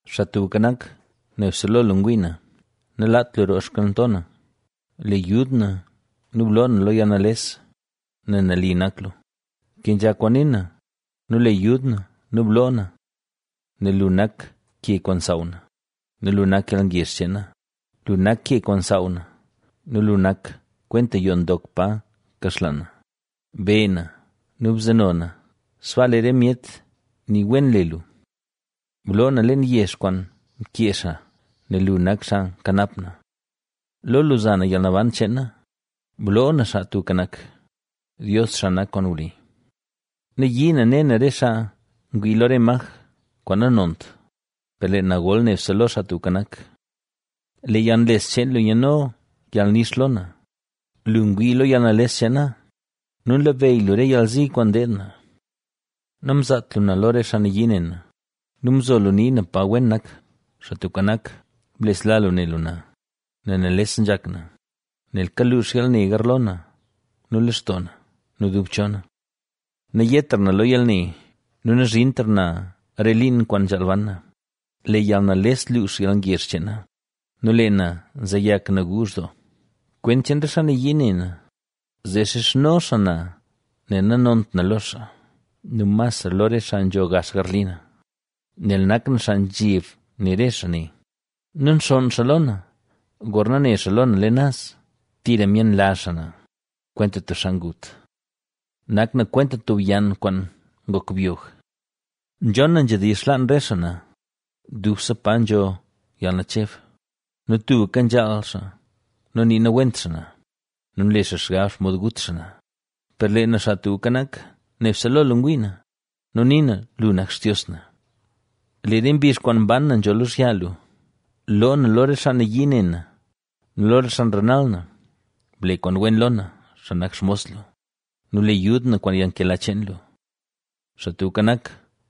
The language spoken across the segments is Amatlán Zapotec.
Xaa Tubka Nak, nebse lo lu ngwii na. ¡Nalaat lu roo xkalnto na! ¡Le yud na nu bloo na lo yalnales, nel nali nak lu! Kenzha kwaan nii na nu le yud na nu bloo na. Nel lu nak ke kwaan nsaaw na ¡nu lu nak yalngezh cheen na! ¡Lu nak ke kwaan nsaaw na! Lu nak kwenta yoo ndok pa nkaxlaan na; be na nu bzeno na, sbaa lee re myet nii wen le lu. ¡Bloo na leen yex kwaan mkee xaa, nel lu nak xaa nkanap na. Lo lu za na yalnaban cheen na, ¡Bloo na, Xaa Tubka Nak, Dios xaa nak kwaan wli! Nayii na ne na re xaa ngwii lo re maj kwaan nanont; per lee na gol nebse lo Xaa Tubka Nak. Lee yalnles cheen lu nyaadno yalnix lo na, lu ngwii lo yalnales cheen na nu nlabeyy lu re yalzi kwaan ndeed na. Namzaat lu na lo re xaa nayii ne na ¡nu mzo lu nii na pa wen nak! Xaa Tubka Nak, blesla lu ne lu na, nel nales nzhak na, nel kaluux yalne garlo na nu lextoo na ¡nu dub cho na! ¡Nayetra na lo yalne, nu nazhintra na re liin kwaan nzhaal ban na! Lee yalnales luux yalngezh cheen na ¡nu lee na nzeyak naguuzh doo! Kwent cheen re xaa nayii ne na, zee nxizhno xaa na nel nanont na lo xaa, nu masra lo re xaa nzho gax garli na, nel nak na xaa nzheb re xaa ne. ¡Nu nxonn xaa lo na, gorna ne xaa lo na leen naz! Tira myenlazh xaa na, kwenta tub xaa ngut. Nak na kwenta tub yann kwaan ngok byog. Nzhon na nzhedizh xlaan re xaa na: “¡Dubse pa nzho yalnacheb!” Nu tubka nzhaal xaa nu nii nawent xaa na, ¡nu nle xaa xgab xomod gut xaa na! Per lee na, Xaa Tubka Nak, nebse lo lu ngwii na nu nii na: “¡Lu nak Xtios na!” Lee re mbizh kwaan ban na nzho lozhya lu; ¡Loo na lo re xaa nayii ne na nu lo re xaa nrenal na! Ble kwaan wen lo na, xaa nak xmos lu nu le yud na kwaan yalnkela cheen lu. Xaa Tubka Nak,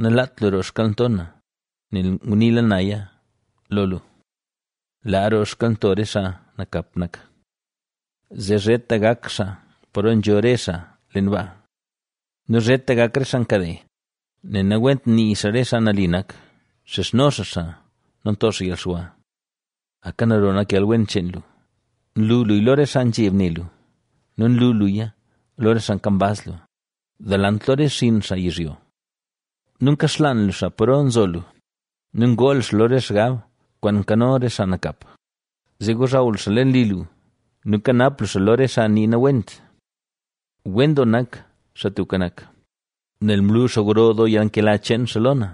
nalaat lu roo xkalnto na, nel nguniila naya lo lu. ¡Laa roo xkalnto re xaa nakap nak, zee zheta gak xaa paro nzho re xaa leen baa! Nu zheta gak re xaa nkade, nel nawent nii xaa re xaa nali nak, nxizhno xaa xaa nu nto xaa yalxwa. Aka naro nak yalwen cheen lu, nlu luya lo re xaa nzheb ne lu nu nlu luya, lo re xaa kambaz lu, delant lo re xinn xaa yizhyo. Nu nkaxlaan lu xaa paro nzo lu nu ngoo lu xaa lo re xgab kwaan nkano re xaa nakap, zee ngozhaw lu xaa leen li lu nu nkanap lu xaa lo re xaa nii nawent. Wen doo nak, Xaa Tubka Nak, nel mlu xaa gro doo yalnkela cheen xaa lo na,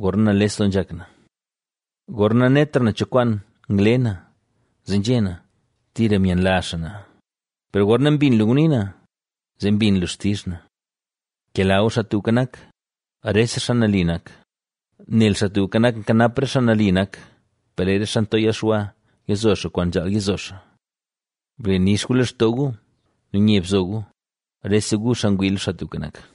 gorna nales doo nzhak na. Gorna nanetra na cho kwaan ngle na, zee nzhé na: “Tira myenlazh xaa na”; per gorna mbin lu ngunii na, zee mbin lu xtizh na. Kela gu Xaa Tubka Nak, rese xaa nali nak, nel Xaa Tubka Nak nkanap re xaa nali nak; per lee re xaa nto yalxwa yazo xaa kwaan nzhaal yizo xaa. Ble nix gu lextoo gu, nu nye bzo gu, rese gu xaa ngwii lo, Xaa Tubka Nak.